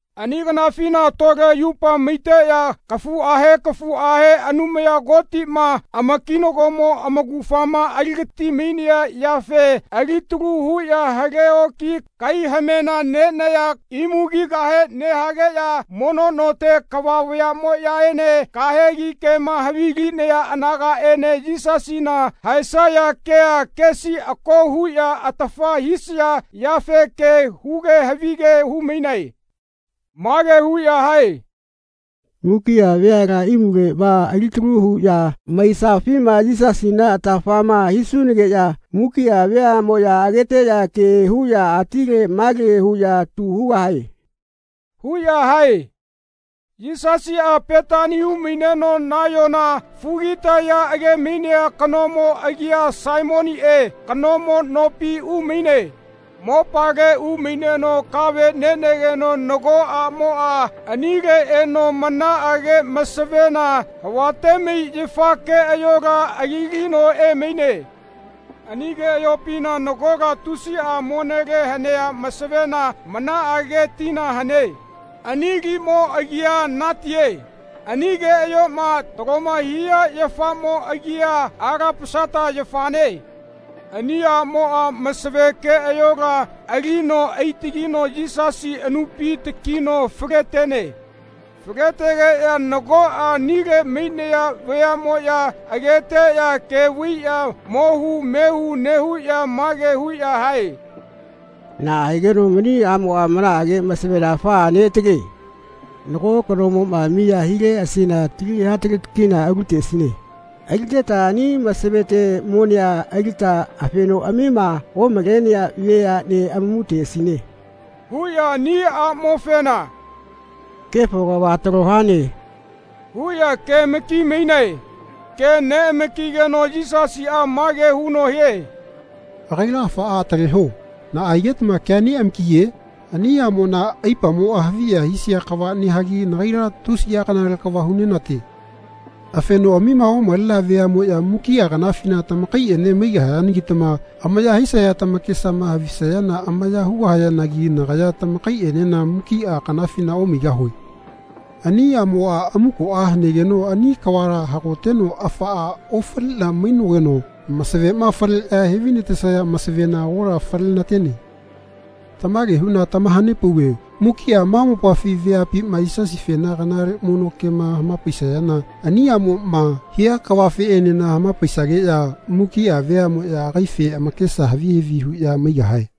Ani kanafina tole yupa maiteꞌya kafuꞌahe kafuꞌahe Anumaya Kotiꞌma amakinagomo amaugafama aligatimainea yafe alitalu huꞌya hale oki kaihamena nenaya imu kigahe nehageꞌya mono note kava vayaꞌmoꞌyaene kahegi kema havilinaya anagaꞌene Yisasina haesaya kea kesi ako huꞌya atafa hisaya yafe ke huge havige humainae. Mage huꞌya hae “Mukiꞌa veala imuleꞌma alitalu huꞌya maisafima Yisasina atafama hisunageꞌya mukiꞌa veaꞌmoꞌya ageteꞌya ke huꞌya atile male huꞌya tu hugahae.” huꞌya hae. Yisasiꞌa Petani umaineno nayona fugitaya agemainea kanomo agia Saimoniꞌe kanomo nopi umaine. Mopale umaineno kave nenegeno nago aꞌmoꞌa anile eno manaꞌage masavena havatemai yafa keꞌayola alilino emaine. Ani keꞌayopina nagola tusiꞌa monele hanea masavena manaꞌage tina hane. Ani limo agia natie. Ani keꞌayoꞌma taloma hia yafamo agia alapasata yafane. Ani aꞌmoꞌa masave keꞌayola alino aitagino Yisasi anupi takino faletene. Faletegeꞌya nagoꞌa anile mainaya vayaꞌmoꞌya ageteꞌya ke vaiꞌya mohu mehu nehuꞌya mage huꞌya hae “Naꞌa higeno mani aꞌmoꞌa manaꞌage masavena afaꞌa neꞌatale? Nago kanomoꞌma miya hileꞌasina tali hataleti kina (K300) aluteꞌasine. Aliteta ani masavete monea alita afenoꞌamima omalenea veaꞌnea amamuteꞌasine.” huꞌya ani aꞌmofena “Kefo kava talo hane.” huꞌya kemakimainae. Ke neꞌamakigeno Yisasiꞌa mage huno hie “Agaila afaꞌa ataleho. Naꞌa higetama kea neꞌamakiye? Ani aꞌmona aipamoꞌa haviya hisia kava nehagi nagaila tusiꞌa kanale kava hunenate. Afenoꞌamima omalenea veaꞌmoꞌya mukiꞌa kanafina tamakaiꞌene maigahayanagitama amaya hisaya tamakesama havisayana amaya hugahayanagi nagaya tamakaiꞌenena mukiꞌa kanafina omaigahue. Ani aꞌmoꞌa amukoꞌa hanegeno ani kavala hagoteno afaꞌa ofaliꞌna mainogeno masavema faleꞌya hevainatesaya masavena agola fale nenate. Tamage huꞌna tamahanepauve mukiꞌa ma mopafi veapima Yisasifena kanale mono kema hamapaisayana ani aꞌmoꞌma hia kavafeꞌenena hamapaisageꞌya mukiꞌa veaꞌmoꞌya agaife amakesa havi havi huꞌya maigahae.”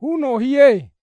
huno hie.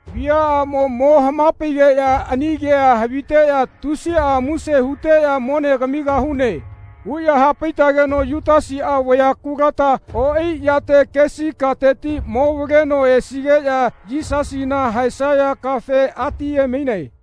Viaꞌamo mo hamapaigeꞌya ani kea haviteꞌya tusiꞌa muse huteꞌya ‘Mone kamigahune.’ huꞌya hapaitageno Yutasiꞌa vaya kuluta oꞌai yate kesi kateti momavaleno esigeꞌya Yisasina haesaya kafe atiyemaine.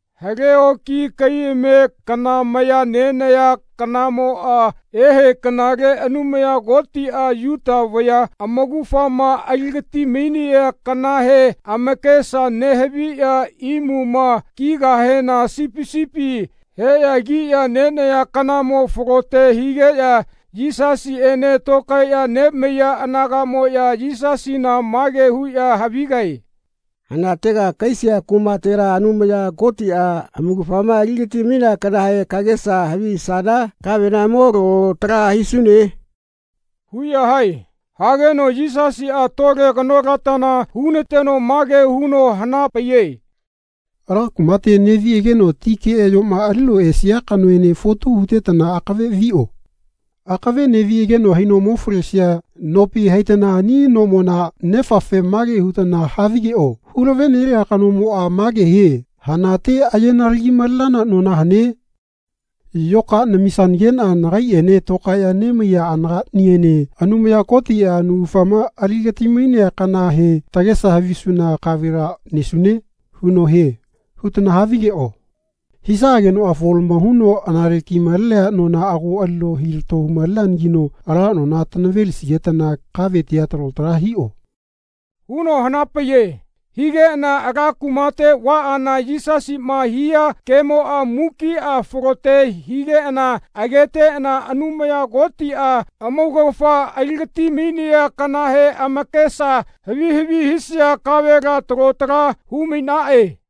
Hale oki kaihame kana maya nenaya kanamoꞌa ehe kanale Anumaya Kotiꞌa Yuta vaya amaugafama aligatimainea kanahe amakesa nehaviya imuma kigahena sipi sipi heꞌya kiꞌya nenaya kanamoꞌa falote higeꞌya Yisasiꞌene tokaeꞌya nemaiya anagaꞌmoꞌya Yisasina mage huꞌya havigae “Hanatega kahaisia kumatela Anumaya Kotiꞌa amaugafama aligatimainea kanahe kagesa havisana kavela mo lalo tala hisune?” huꞌya hae. Hageno Yisasiꞌa tole kanolatana hunateno mage huno hanapaiye “Ala kumate neꞌviꞌageno ti keꞌayoꞌma alino esia kanoene fotu hutetana akave viꞌo. Akave neꞌviꞌageno haino mo falesia nopi haitana ani nomona nefafe mage hutana havigeꞌo ‘Hulavenelia kanomoꞌa mage hie ‘Hanate ayenalagimalenana nona hane? Yoka namisanageꞌna nagaiꞌene tokaeꞌya nemaiya anagaꞌniene Anumaya Kotiꞌa amaugafama aligatimainea kanahe tagesa havisuna kavela nesune?’ huno hie.’ hutana havigeꞌo. Hisaꞌagenoꞌa folamo huno anale kimalenea nona ago alino hilato humaleneanagino ala nona tanavelisigetana kavetia talo tala hiꞌo.” huno hanapaiye. Higeꞌana ala kumate vaꞌana Yisasiꞌma hia kemoꞌa mukiꞌa falote higeꞌana ageteꞌana Anumaya Kotiꞌa amaugafa aligatimainea kanahe amakesa havi havi hisaya kavela talo tala humainaꞌe.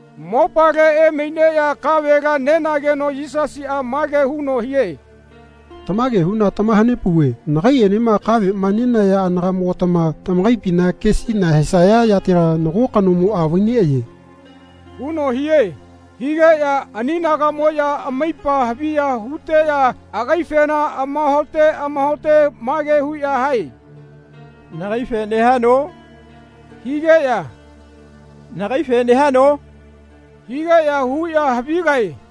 Mopale emaineꞌya kavela nenageno Yisasiꞌa mage huno hie “Tamage huꞌna tamahanepauve nagaiꞌenema kaveꞌma nenaya anagaꞌmogatama tamakaipiti kesi nahaesaya yatela nago kanomoꞌa vaineꞌaye.” huno hie. Higeꞌya ani anagaꞌmoꞌya amaipa haviya huteꞌya agaifena amahaote amahaote mage huꞌya hae “Nagaife nehano?” higeꞌya “Nagaife nehano?” higeꞌya huꞌya havigae.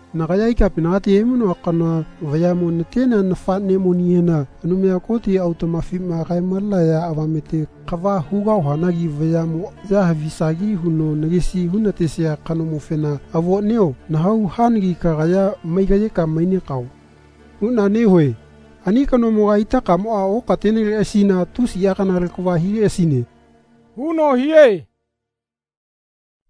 Nagaya ikapinagati emainoa kanoa vayaꞌmo natenea nafaꞌnemonihena Anumaya Koti autaꞌmafima kaemalenaya avamete kava hugahuanagi vayaꞌmoꞌya havisagi huno nagesi hunatesia kanomofena ‘Avoꞌnio nahau hanagi kagaya maigaꞌyeka mainekao.’ huꞌna nehue. Ani kanomoga itakamoꞌa okateneleꞌasina tusiꞌa kanale kava hileꞌasine.” huno hie.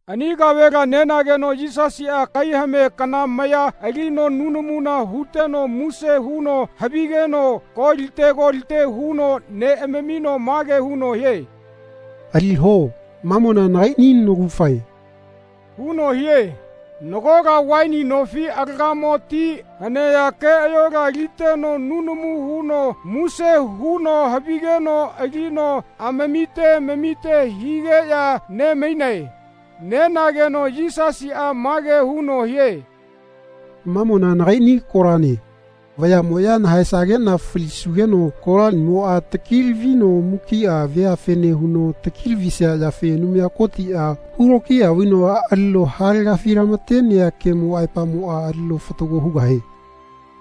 Ani kavela nenageno Yisasiꞌa kaihame kana maya alino nunamu huteno muse huno havigeno kolite kolite huno neꞌamamino mage huno hie “Aliho. Mamona nagaiꞌni naugafae.” huno hie. Nagola vaini nofi alagamo ti hanea keꞌayola aliteno nunamu huno muse huno havigeno alino amamite amamite higeꞌya nemainae. Nenageno Yisasiꞌa mage huno hie “Mamona nagaiꞌni kolane. Vayaꞌmoꞌya nahaesageꞌna falisugeno kolaniꞌamoꞌa takilavino mukiꞌa veafene huno takilavisia yafe Anumaya Kotiꞌa hulokiya vaino alino halegafilamatenea kemo aepamoꞌa alino fatago hugahie.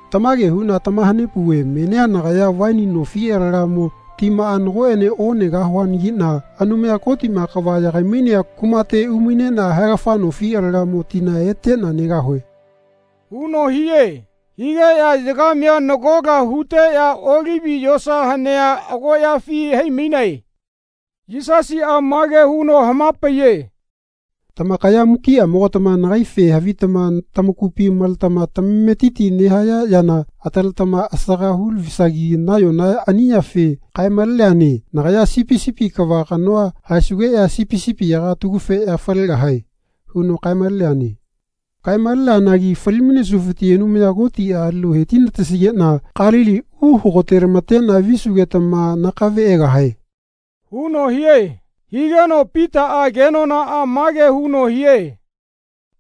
Tamage huꞌna tamahanepauve menia nagaya vaini nofi alagamo timaꞌa nagoꞌene onegahuanagiꞌna Anumaya Kotiꞌma kava yagaimainea kumate umaineꞌna haegafa nofi alagamo tina eteꞌna negahue.” huno hie. Higeꞌya yagamea nagola huteꞌya Olivi yosa hanea agoꞌyafi haimainae. Yisasiꞌa mage huno hamapaiye “Tamakaya mukiꞌamogatama nagaife havitama tamakupi maletama tamametiti nehaya yana ataletama asaga hulavisagi nayona ani yafe kaemaleneane ‘Nagaya sipi sipi kava kanoa haesugeꞌya sipi sipiyaga atagufeꞌya falegahae.’ huno kaemaleneane. Kaemaleneanagi falimainesufiti Anumaya Kotiꞌa alino hetinatesigeꞌna Kalili uhagotelamateꞌna visugetama nakave egahae.” huno hie. Higeno Pitaꞌa kenonaꞌa mage huno hie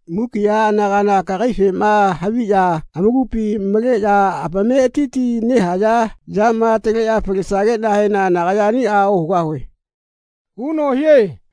“Mukiꞌa anagala kagaifema haviꞌya amakupi maleꞌya amametiti nehaya yama ataleꞌya falesageꞌnahena nagaya aniꞌa ohugahue.” huno hie.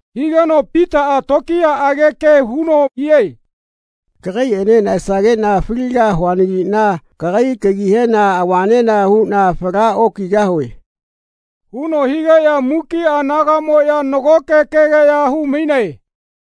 Higeno Pitaꞌa tokiyaꞌage ke huno hie “Kagaiꞌene nahaesageꞌna faligahuanagiꞌna kagai kagihena avanena huꞌna fala okigahue.” huno higeꞌya mukiꞌa anagaꞌmoꞌya nagoke kegeꞌya humainae.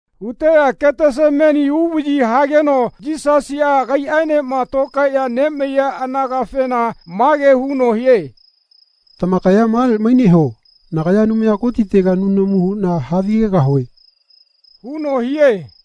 Huteꞌya Ketesemani uvaꞌyi hageno Yisasiꞌa agaiꞌaenema tokaeꞌya nemaiya anagafena mage huno hie “Tamakaya male maineho. Nagaya Anumaya Kotitega nunamu huꞌna havigegahue.” huno hie.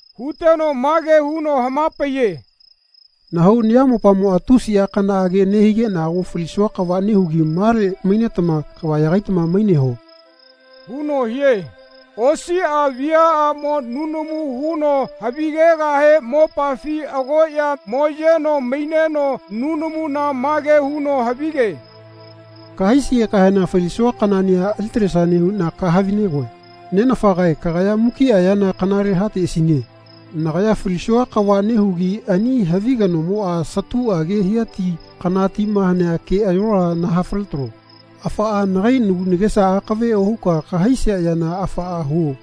Huteno mage huno hamapaiye “Nahau nayamopamoꞌa tusiꞌa kanaꞌage nehigeꞌna ago falisua kava nehugi male mainetama kava yagaitama maineho.” huno hie. Osiꞌa viaꞌamo nunamu huno havigegahe mopafi agoꞌya moyeno maineno nunamuna mage huno havige “Kahaisigekahena falisua kanaꞌnia alitalesane huꞌna kahavinegoe. Nenafagae kagaya mukiꞌa yana kanale hateꞌasine. Nagaya falisua kava nehugi ani havi kanamoꞌa satuꞌage hia ti kana tima hanea keꞌayola nahafaletalo. Afaꞌa nagai nagu nagesa akave ohuka kahaisia yana afaꞌa huo.”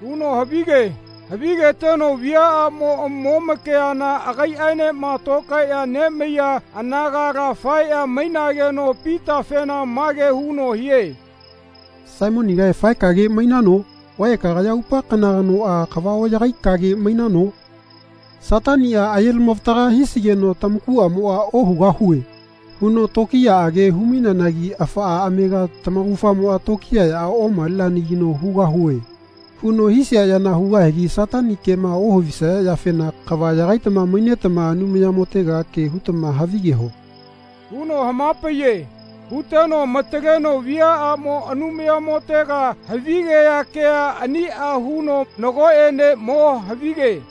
huno havige. Havigeteno viaꞌamo momakeana agaiꞌaenema tokaeꞌya nemaiya anagala faeꞌya mainageno Pitafena mage huno hie “Saimonigae faekage mainano? Vae kagaya aupa kana kanoꞌa kava oꞌyagaikage mainano? Sataniꞌa ayelamavataga hisigeno tamakuꞌamoꞌa ‘Ohugahue.’ huno tokiyaꞌage humaineanagi afaꞌa amega tamaugafamoꞌa tokiyaꞌa omaleneanagino ‘Hugahue.’ huno hisia yana hugahigi Satani kema ohavisaya yafena kava yagaitama mainetama Anumayamotega ke hutama havigeho.” huno hamapaiye. Huteno amataleno viaꞌamo Anumayamotega havigea kea aniꞌa huno nagoꞌene mo havige.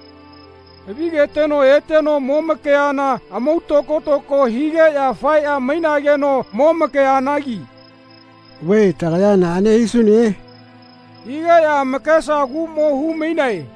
Havigeteno eteno momakeana amau tokotoko higeꞌya faeꞌya mainageno momakeanagi “Vae tagaya naꞌane hisune?” hugeꞌya amakesaguꞌmo humainae.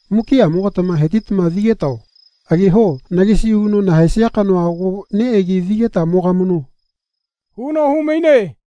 Mukiꞌamogatama hetitama vigetao. Ageho nagesi huno nahaesia kanoa ago neꞌegi vigeta mogamano.” huno humaine.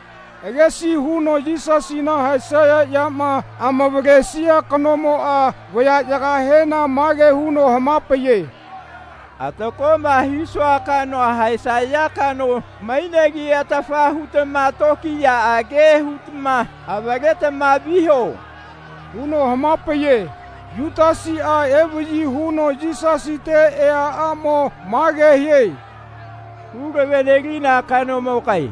Agesi huno Yisasina haesaya yama amavalisea kanomoꞌa vayaꞌyagahena mage huno hamapaiye “Atakoꞌma hisua kanoa haesaya kano mainegi atafa hutama tokiyaꞌage hutama avaletama viho.” huno hamapaiye. Yutasiꞌa evaꞌyi huno Yisasite eaꞌamo mage hie “Hulavenelina kanomogae.”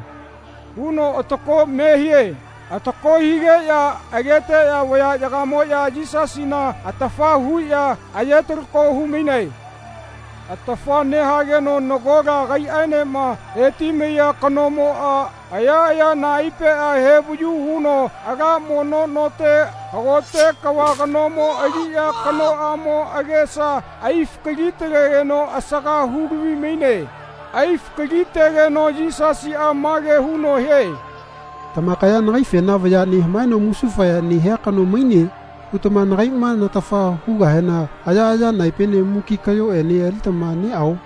nehuno atako me hie. Atako higeꞌya ageteꞌya vayaꞌyagamoꞌya Yisasina atafa huꞌya ayetalako humainae. Atafa nehageno nagola agaiꞌaenema hetimaiya kanomoꞌa ayaꞌaya naepeꞌa hevayu huno ala mono note hagote kava kanomo aliꞌya kanoꞌamo agesa aifakalitalegeno asaka hulavimaine. Aifakalitegeno Yisasiꞌa mage huno hie “Tamakaya nagaifena ‘Vaya nehamaeno musufaya nehia kano maine.’ hutama nagaiꞌma natafa hugahena ayaꞌaya naepene muki kaꞌyoꞌene alitama neꞌao?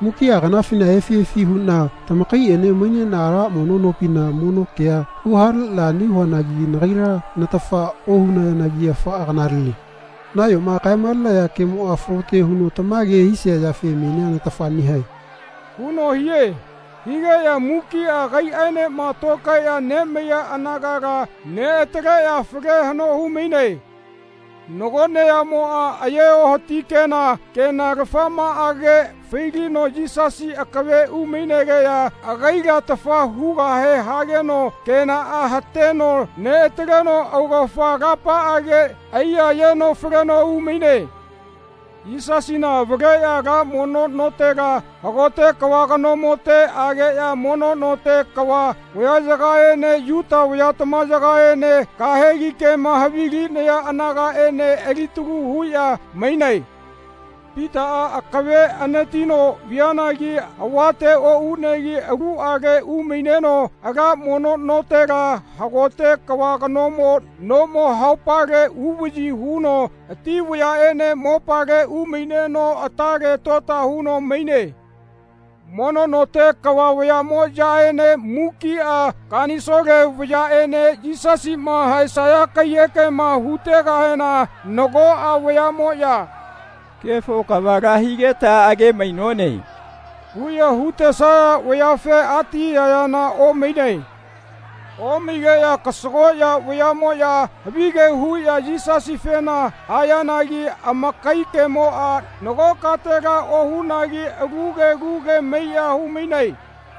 Mukiꞌa kanafina efiꞌefi huꞌna tamakaiꞌene maineꞌna ala mono nopina mono kea huhaleꞌna nehuanagi nagaila natafa ohunayanagi afaꞌa kanalele. Nayoma kaemalenaya kemoꞌa falote huno tamage hisia yafe menia natafa nehae.” huno hie. Higeꞌya mukiꞌa agaiꞌaenema tokaeꞌya nemaiya anagala neꞌataleꞌya fale haꞌno humainae. Nago neyamoꞌa aye ohati kena kenalafamaꞌage failino Yisasi akave umainegeꞌya agaila atafa hugahe hageno kenaꞌa hateno neꞌataleno augafa alapaꞌage aiyayeno faleno umaine. Yisasina avaleꞌya ala mono notela hagote kava kanomote ageꞌya mono note kava vayaꞌyagaene Yuta vayatamayagaene kahegi kema havilinaya anagaꞌene alitalu huꞌya mainae. Pitaꞌa akave anatino vianagi avatela oꞌunegi aluꞌale umaineno ala mono notela hagote kava kanomo nomo haupale uvaꞌyi huno ati vayaꞌene mopale umaineno atale tota huno maine. Mono note kava vayaꞌmoꞌyaene mukiꞌa kanisole vayaꞌene Yisasiꞌma haesaya kaiyekema hutegahena nagoꞌa vayaꞌmoꞌya “Kefo kavala higeta agemainone.” huꞌya hutesaya vayafe atiyayana omainae. Omaigeꞌya kasagoꞌya vayaꞌmoꞌya havige huꞌya Yisasifena hayanagi amakai kemoꞌa nago katela ohunagi alu ke alu ke maiꞌya humainae.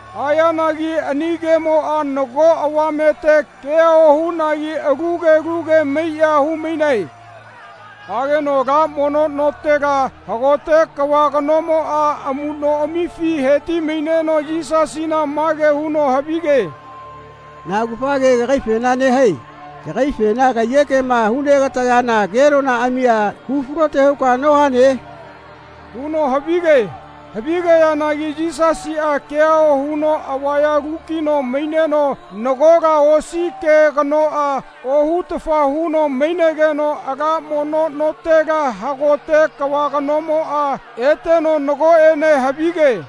Hayanagi ani kemoꞌa nago avamete kea ohunagi alu ke alu ke maiꞌya humainae. Hageno ala mono notela hagote kava kanomoꞌa amuꞌnoꞌamifi hetimaineno Yisasina mage huno havige “Na augafa ke kagaifena nehae? Kagaifena kaiyekema hunegatayana kenonaꞌamia hufalote huka nohane?” huno havige. Havigeanagi Yisasiꞌa kea ohuno avaya lukino maineno nagola osi ke kanoꞌa ohutafa huno mainegeno ala mono notela hagote kava kanomoꞌa eteno nagoꞌene havige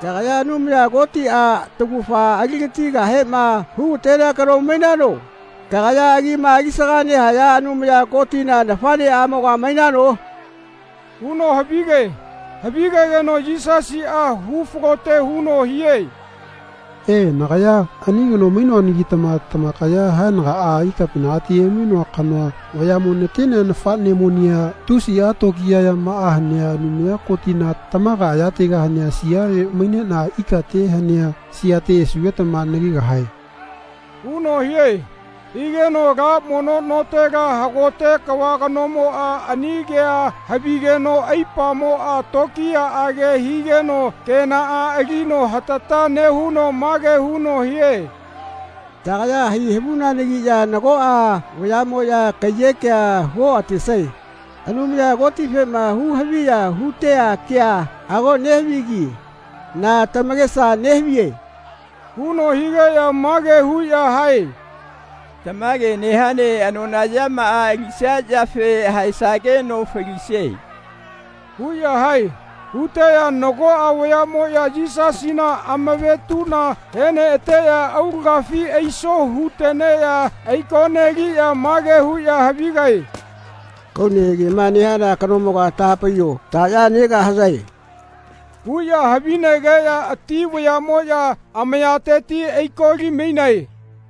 “Kagaya Anumaya Kotiꞌa taugafa aligatigahema hugatenea kano mainano? Kagaya agima alisaga nehaya Anumaya Kotina nafaꞌneꞌamoga mainano?” huno havige. Havigegeno Yisasiꞌa hufalote huno hie “E, nagaya ani kano mainoanagitama tamakaya haenagaꞌa Ikapinagati emainoa kanoa vayaꞌmo natenea nafaꞌnemonia tusiꞌa tokiya yamaꞌa hanea Anumaya Kotina tamaga ayatega hanea siale maineꞌna ikate hanea siate esugetama nagegahae.” huno hie. Higeno ala mono notela hagote kava kanomoꞌa ani kea havigeno aipamoꞌa tokiyaꞌage higeno kenaꞌa alino hatata nehuno mage huno hie “Tagaya hai havunanagiꞌya nagoꞌa vayaꞌmoꞌya kaiyekea huoꞌatesae. Anumaya Kotifema huhaviya hutea kea ago nehavigi. Na tamakesa nehaviye?” huno higeꞌya mage huꞌya hae “Tamage nehane anona yamaꞌa alisia yafe haesageno falisie.” huꞌya hae. Huteꞌya nagoꞌa vayaꞌmoꞌya Yisasina amavetuꞌna heneꞌateꞌya aulagafi aiso huteneꞌya aikoneliꞌya mage huꞌya havigae “Kaune kema nehana kanomoga tahapaiyo taꞌya negahayae?” huꞌya havinegeꞌya ati vayaꞌmoꞌya amayateti aikolimainae.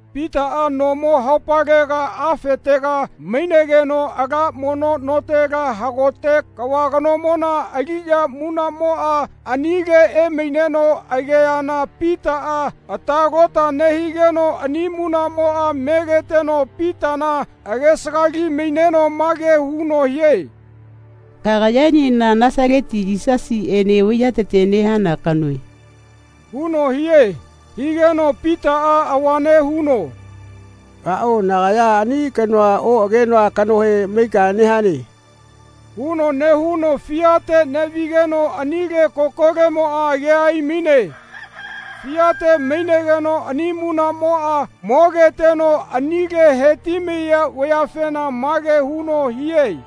Pitaꞌa nomo haupalega afetega mainegeno ala mono notela hagote kava kanomona aliꞌya munaꞌmoꞌa anile emaineno ageana Pitaꞌa ata lota nehigeno ani munaꞌmoꞌa megeteno Pitana agesagali maineno mage huno hie “Kagayaenena Nasaleti Yisasiꞌene vaiyatete nehana kanoe.” huno hie. Higeno Pitaꞌa avane huno “Aꞌao nagaya ani kanoa oꞌagenoa kanohe maika nehane.” huno nehuno fiate neꞌvigeno anile kokolemoꞌa agea aimaine. Fiate mainegeno ani munaꞌmoꞌa mogeteno anile hetimaiya vayafena mage huno hie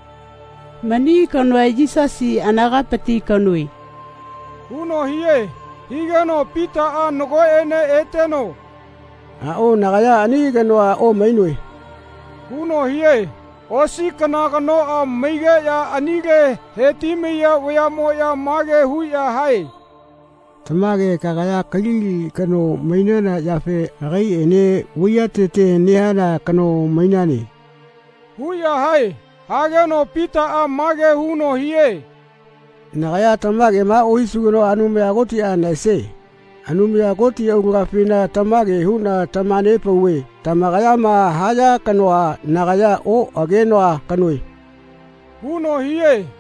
“Mani kanoa Yisasi anagapiti kanoe.” huno hie. Higeno Pitaꞌa nagoꞌene eteno “Aꞌao nagaya ani kanoa omainoe.” huno hie. Osi kana kanoꞌa maigeꞌya anile hetimaiya vayaꞌmoꞌya mage huꞌya hae “Tamage kagaya Kalili kano mainana yafe agaiꞌene vaiyatete nehana kano mainane.” huꞌya hae. Hageno Pitaꞌa mage huno hie “Nagaya tamagema ohisugenoꞌa Anumaya Kotiꞌa nahaesie. Anumaya Koti aulagafina tamage huꞌna tamahanepauve tamakayama haya kanoa nagaya oꞌagenoa kanoe.” huno hie.